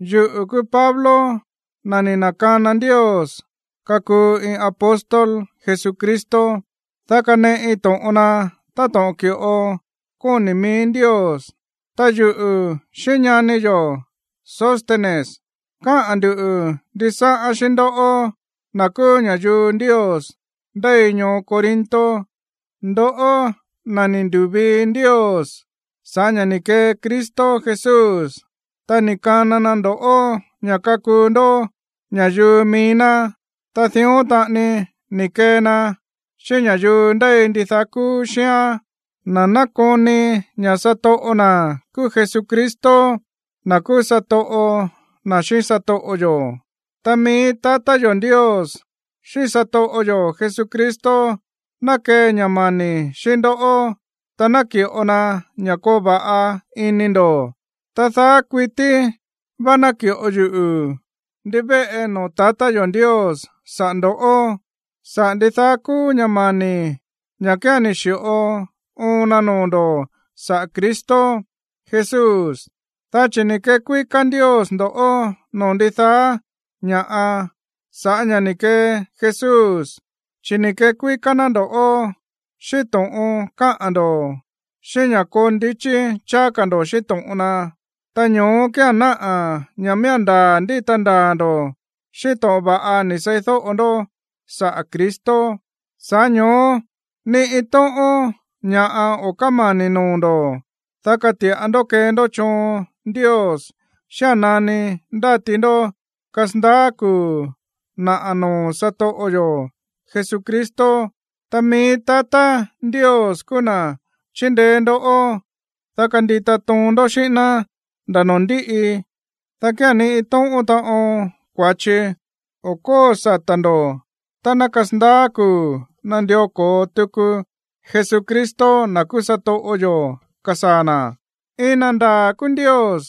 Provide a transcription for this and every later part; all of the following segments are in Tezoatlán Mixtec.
Yuꞌu̱ kúú Pablo, na̱ ni̱ na̱kana Ndios kakuu iin apóstol Jesucristo, dá kaneꞌi to̱ꞌon na, táto̱ꞌon ki̱ꞌo kóni̱ mií Ndios. Ta yuꞌu̱ xíꞌín ñani yo̱ Sóstenes káꞌa̱n ndu̱ ndisáꞌán xíꞌín ndoꞌó, na̱ kúú ña̱yuu Ndios ndéi ñoo Corinto, ndoꞌó na̱ ni̱ ndu̱vii Ndios sa̱ꞌá ña̱ ni̱ kee Cristo Jesús, ta ni̱ kana na ndo̱ꞌó ña̱ kakuu ndó ña̱yuu mií ná, ta dión taꞌani ni̱ kee na xíꞌín ña̱yuu ndéi ndidaá kúú xíán, na̱ nákoni ña̱ satoꞌo na̱ kúú Jesucristo, na̱ kúú satoꞌo na̱ xíꞌín satoꞌo yo̱. Ta mií tatá yo̱ Ndios xíꞌín satoꞌo yo̱ Jesucristo ná kee ña̱ mani̱ xíꞌín ndó, ta naki̱ꞌo na ña̱ koo va̱ꞌa ini ndo̱. Ta daá kuití vá náki̱ꞌo yuꞌu̱ ndivéꞌe noo̱ tatá yo̱ Ndios saꞌa̱ ndo̱ꞌó, saꞌa̱ ndidaá kúú ña̱ mani̱ ña̱ kía̱n ni̱ xi̱ꞌo oon na noo̱ ndo̱ saꞌa̱ Cristo Jesús. Dá chi̱ ni̱ kekuíká Ndios ndo̱ꞌó noo̱ ndidaá ña̱ꞌa sa̱ꞌá ña̱ ni̱ kee Jesús, chi̱ ni̱ kekuíká ná ndo̱ꞌó xíꞌín to̱ꞌon káꞌa̱n ndo̱, xíꞌín ña̱ koo ndichí cháá ka̱ ndo̱ xíꞌín to̱ꞌon na. Ta ño̱ó kía̱n náꞌa̱ ña̱ miía̱n ndaa̱ ndíta ndaa̱ ndo̱ xíꞌín to̱ꞌon va̱ꞌa ni̱ seídóꞌo ndó saꞌa̱ Cristo. Sa̱ꞌá ño̱ó ni iin tóꞌón ña̱ꞌa o̱ kámani̱ noo̱ ndo̱, dá kati̱ꞌa ndó kee ndó choon Ndios xía̱n nani ndáti ndó kasandaá kuu̱ naꞌa̱ noo̱ satoꞌo yo̱ Jesucristo. Ta mií tatá Ndios kúú na̱ chindeé ndoꞌó, dá kandita toon ndó xíꞌín ná nda̱ noo̱ ndíꞌi, dá kía̱n ni iin tóꞌón taꞌon kua̱chi o̱ kóo sata̱ ndo̱ tá ná kasandaá kuu̱ nandió ko̱o tuku Jesucristo, na̱ kúú satoꞌo yo̱, kasaa̱ na̱. Iin na ndaa̱ kúú Ndios,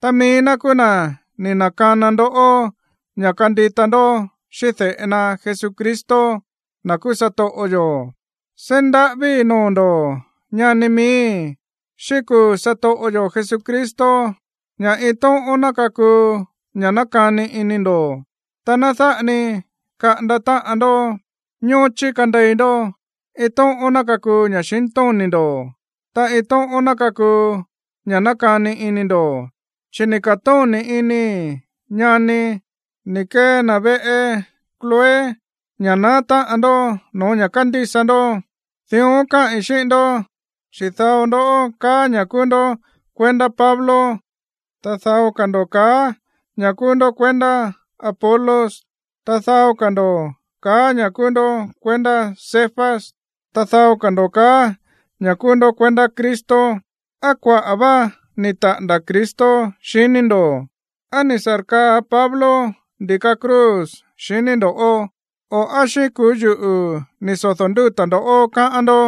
ta mií ná kúú na̱ ni̱ na̱kana ndoꞌó ña̱ kandita ndó xíꞌín de̱ꞌe na Jesucristo, na̱ kúú satoꞌo yo̱. Seí ndaꞌávíi̱ noo̱ ndo̱ꞌó, ñani miíi̱, xíꞌín kuu̱ satoꞌo yo̱ Jesucristo ña̱ iin tóꞌón ná kakuu ña̱ nákani ini ndo̱, ta ná dáꞌa ni kaꞌanda táꞌan ndó. Ñóchí kandei ndó, iin tóꞌón ná kakuu ña̱xintóni̱ ndo̱, ta iin tóꞌón ná kakuu ña̱ nákani ini ndo̱. Chi̱ ni̱ ka̱tóni̱ inii̱, ñanii̱, ni̱ kee na̱ veꞌe Cloé, ña̱ naá táꞌan ndó no̱ó ña̱ kándísa ndó. Dión káꞌi̱n xíꞌín ndó, dá chi̱ dao ndó kaá ña̱ kúú ndó kuendá Pablo, ta dao ka̱ ndo̱ kaá ña̱ kúú ndó kuendá Apolos, ta dao ka̱ ndo̱ kaá ña̱ kúú ndó kuendá Cefas, ta dao ka̱ ndo̱ kaá ña̱ kúú ndó kuendá Cristo. ¿Á kuaꞌa̱ vá ni̱ taꞌa̱nda̱ Cristo, xiní ndo̱? ¿Á ni̱ sa̱rkaa Pablo ndi̱ka cruz, xiní ndo̱? O, ¿á xíꞌín kuu̱ yuꞌu̱ ni̱ sodo̱ ndúta̱ ndo̱ꞌó, káꞌán ndó?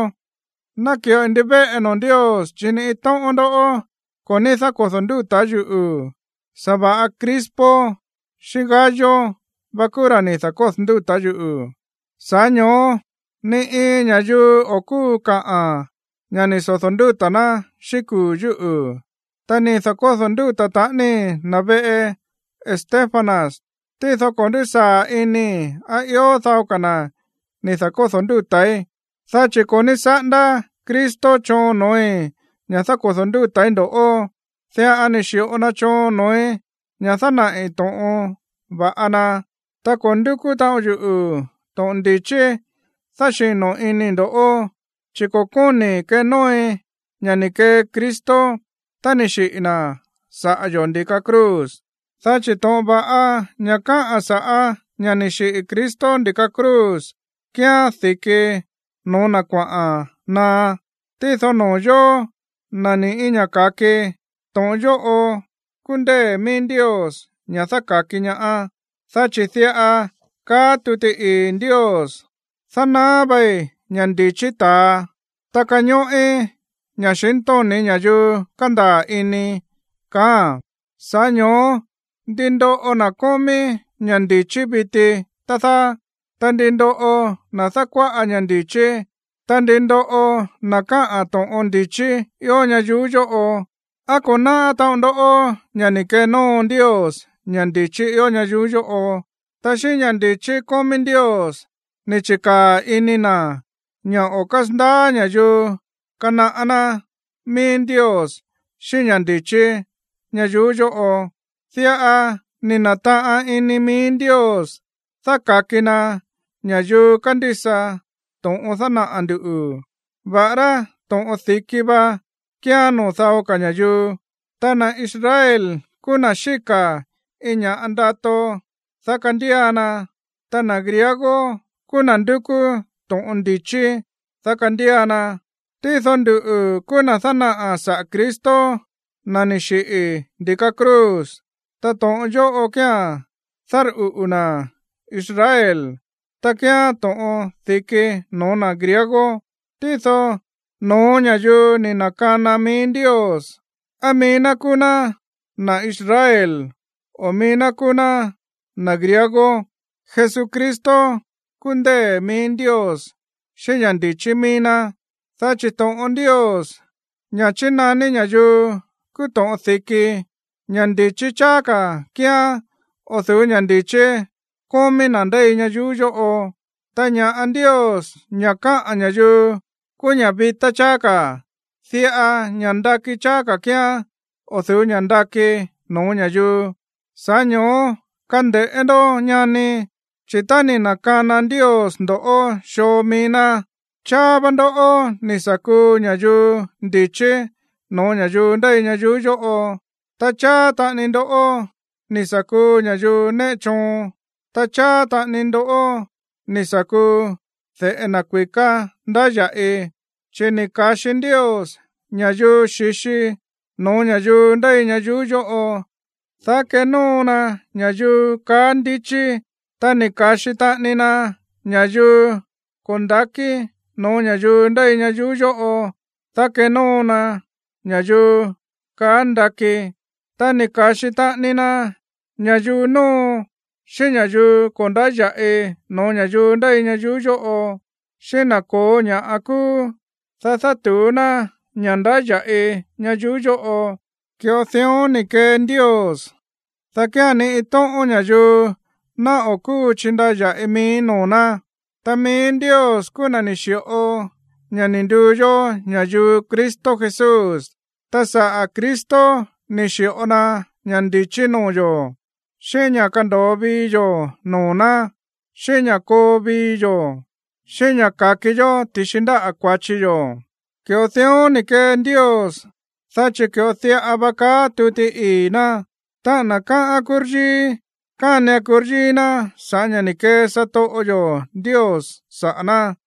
Náki̱ꞌoi ndivéꞌe noo̱ Ndios chi̱ ni iin tóꞌón ndó ko̱ ní dákodo̱ ndúta̱ yuꞌu̱, sa̱va̱ꞌa Crispo xíꞌín Gayo va kúú ra̱ ni̱ da̱kódo̱ ndúta̱ yuꞌu̱. Sa̱ꞌá ño̱ó ni iin ña̱yuu o̱ kúu kaa ña̱ ni̱ sodo̱ ndúta̱ ná xíꞌín kuu̱ yúꞌu̱. Ta ni̱ da̱kódo̱ ndúta̱ taꞌanii na̱ veꞌe Estéfanas, tído ko̱ ndúsaa̱ inii̱ á ió dao ka̱ na̱ ni̱ da̱kódo̱ ndúta̱í. Dá chi̱ ko̱ ní saꞌándá Cristo choon noo̱í ña̱ dákodo̱ ndúta̱í ndo̱ꞌó, diꞌa ni̱ xi̱ꞌo na choon noo̱í ña̱ dánaꞌi̱ to̱ꞌon va̱ꞌa na. Ta ko̱ ndúkú taꞌon yuꞌu̱ to̱ꞌon ndi̱chí dáxino̱ inii̱ ndo̱ꞌó, chi̱ ko̱ kóni̱i̱ kenóoi ña̱ ni̱ kee Cristo tá ni̱ xiꞌi̱ na̱ saꞌa̱ yo̱ ndi̱ka cruz. Dá chi̱ to̱ꞌon va̱ꞌa ña̱ káꞌa̱n sa̱ꞌá ña̱ ni̱ xiꞌi̱ Cristo ndi̱ka cruz kíán di̱ki no̱ó na̱ kuaꞌa̱n naá. Tído noo̱ yóó, na̱ ni̱ꞌí ña̱ ka̱ki, to̱ꞌon yóꞌo kúú ndée̱ mií Ndios ña̱ dáka̱ki ñaá. Dá chi̱ diꞌa káꞌa̱n tuti ii̱ Ndios: Dánaá vai ña̱ ndi̱chí ta̱a, ta kañóꞌí ña̱xintóni̱ ña̱yuu kándaa̱ ini. Sa̱ꞌá ño̱ó, ¿ndi ndóꞌo na̱ kómí ña̱ ndi̱chí viti, tá dáá? Ta, ¿ndi ndóꞌo na̱ dákuáꞌa ña̱ ndi̱chí? Ta, ¿ndi ndóꞌo na̱ káꞌa̱n to̱ꞌon ndi̱chí ió ñayuú yóꞌo? ¿Á ko̱ náꞌá taꞌon ndó ña̱ ni̱ kenóo Ndios ña̱ ndi̱chí ió ñayuú yóꞌo? Ta xíꞌín ña̱ ndi̱chí kómí Ndios ni̱ chi̱kaa̱ ini na̱ ña̱ o̱ kásandaá ña̱yuu kanaꞌá ná mií Ndios xíꞌín ña̱ ndi̱chí ñayuú yóꞌo. Diꞌa ni̱ na̱taꞌan ini mií Ndios dáka̱ki na ña̱yuu kándísa to̱ꞌon dánaꞌa̱ ndu̱, va̱ꞌará to̱ꞌon di̱kí va kíán noo̱ dao ka̱ ña̱yuu. Ta na̱ Israel kúú na̱ xíka̱ iin ña̱ ndato, dá kandía na, ta na̱ griego kúú na̱ ndúkú to̱ꞌon ndi̱chí, dá kandía na. Tído nduꞌu̱ kúú na̱ dánaꞌa̱ saꞌa̱ Cristo, na̱ ni̱ xiꞌi̱ ndi̱ka cruz. Ta to̱ꞌon yóꞌo kía̱n dárꞌuꞌu̱ na̱ Israel, ta kíán to̱ꞌon di̱ki no̱ó na̱ griego. Tído no̱ó ña̱yuu ni̱ na̱kana mií Ndios, á mií ná kúú ná na̱ Israel, o á mií ná kúú ná na̱ griego, Jesucristo kúú ndée̱ mií Ndios xíꞌín ña̱ ndi̱chí mií ná. Dá chi̱ to̱ꞌon Ndios, ña̱ chínaní ña̱yuu kúú to̱ꞌon di̱ki, ña̱ ndi̱chí cháá ka̱ kíán o̱ du̱ú ña̱ ndi̱chí kómí na̱ ndéi ñayuú yóꞌo. Ta ña̱ꞌa Ndios, ña̱ káꞌán ña̱yuu kúú ña̱ vitá cháá ka̱, diꞌa ña̱ꞌa ndakí cháá ka̱ kíán o̱ du̱ú ña̱ ndakí no̱ó ña̱yuu. Sa̱ꞌá ño̱ó, kande̱ꞌé ndó, ñani, chi̱ tá ni̱ na̱kana Ndios ndo̱ꞌó xoo mií ná, cháá vá ndó ni̱ sa̱ kuu ña̱yuu ndi̱chí no̱ó ña̱yuu ndéi ñayuú yóꞌo, ta cháá taꞌani ndó ni̱ sa̱ kuu ña̱yuu néꞌe choon, ta cháá taꞌani ndó ni̱ sa̱ kuu de̱ꞌe na̱ kui̱ká ndáya̱ꞌi. Chi̱ ni̱ ka̱xi Ndios ña̱yuu xi̱xi no̱ó ña̱yuu ndéi ñayuú yóꞌo, dá kenóo na ña̱yuu kaá ndichí. Ta ni̱ ka̱xi taꞌani na ña̱yuu ko̱ nda̱kí no̱ó ña̱yuu ndéi ñayuú yóꞌo, dá kenóo na ña̱yuu kaá ndakí. Ta ni̱ ka̱xi taꞌani na ña̱yuu nóo xíꞌín ña̱yuu ko̱ ndáya̱ꞌi no̱ó ña̱yuu ndéi ñayuú yóꞌo, xíꞌín na̱ ko̱ó ña̱ꞌa kúú, dá dátu̱ú ná ña̱ ndáya̱ꞌi ñayuú yóꞌo. Ki̱ꞌo dión ni̱ kee Ndios, dá kía̱n ni iin tóꞌón ña̱yuu ná o̱ kúu chindaya̱ꞌi mií noo̱ ná. Ta mií Ndios kúú na̱ ni̱ xi̱ꞌo ña̱ ni̱ nduu yó ña̱yuu Cristo Jesús, ta sa̱ꞌá Cristo ni̱ xi̱ꞌo na ña̱ ndi̱chí noo̱ yo̱, xíꞌín ña̱ kando̱o vii yo̱ noo̱ ná, xíꞌín ña̱ koo vii yo̱, xíꞌín ña̱ ka̱ki yó ti̱xi ndáꞌa̱ kua̱chi yo̱. Ki̱ꞌo dión ni̱ kee Ndios, dá chi̱ ki̱ꞌo diꞌa va káꞌa̱n tuti ii̱ ná: “Táꞌa̱n na̱ káꞌán kuryíí, kánian kuryíí ná sa̱ꞌá ña̱ ni̱ kee satoꞌo yo̱ Ndios saꞌa̱ ná.”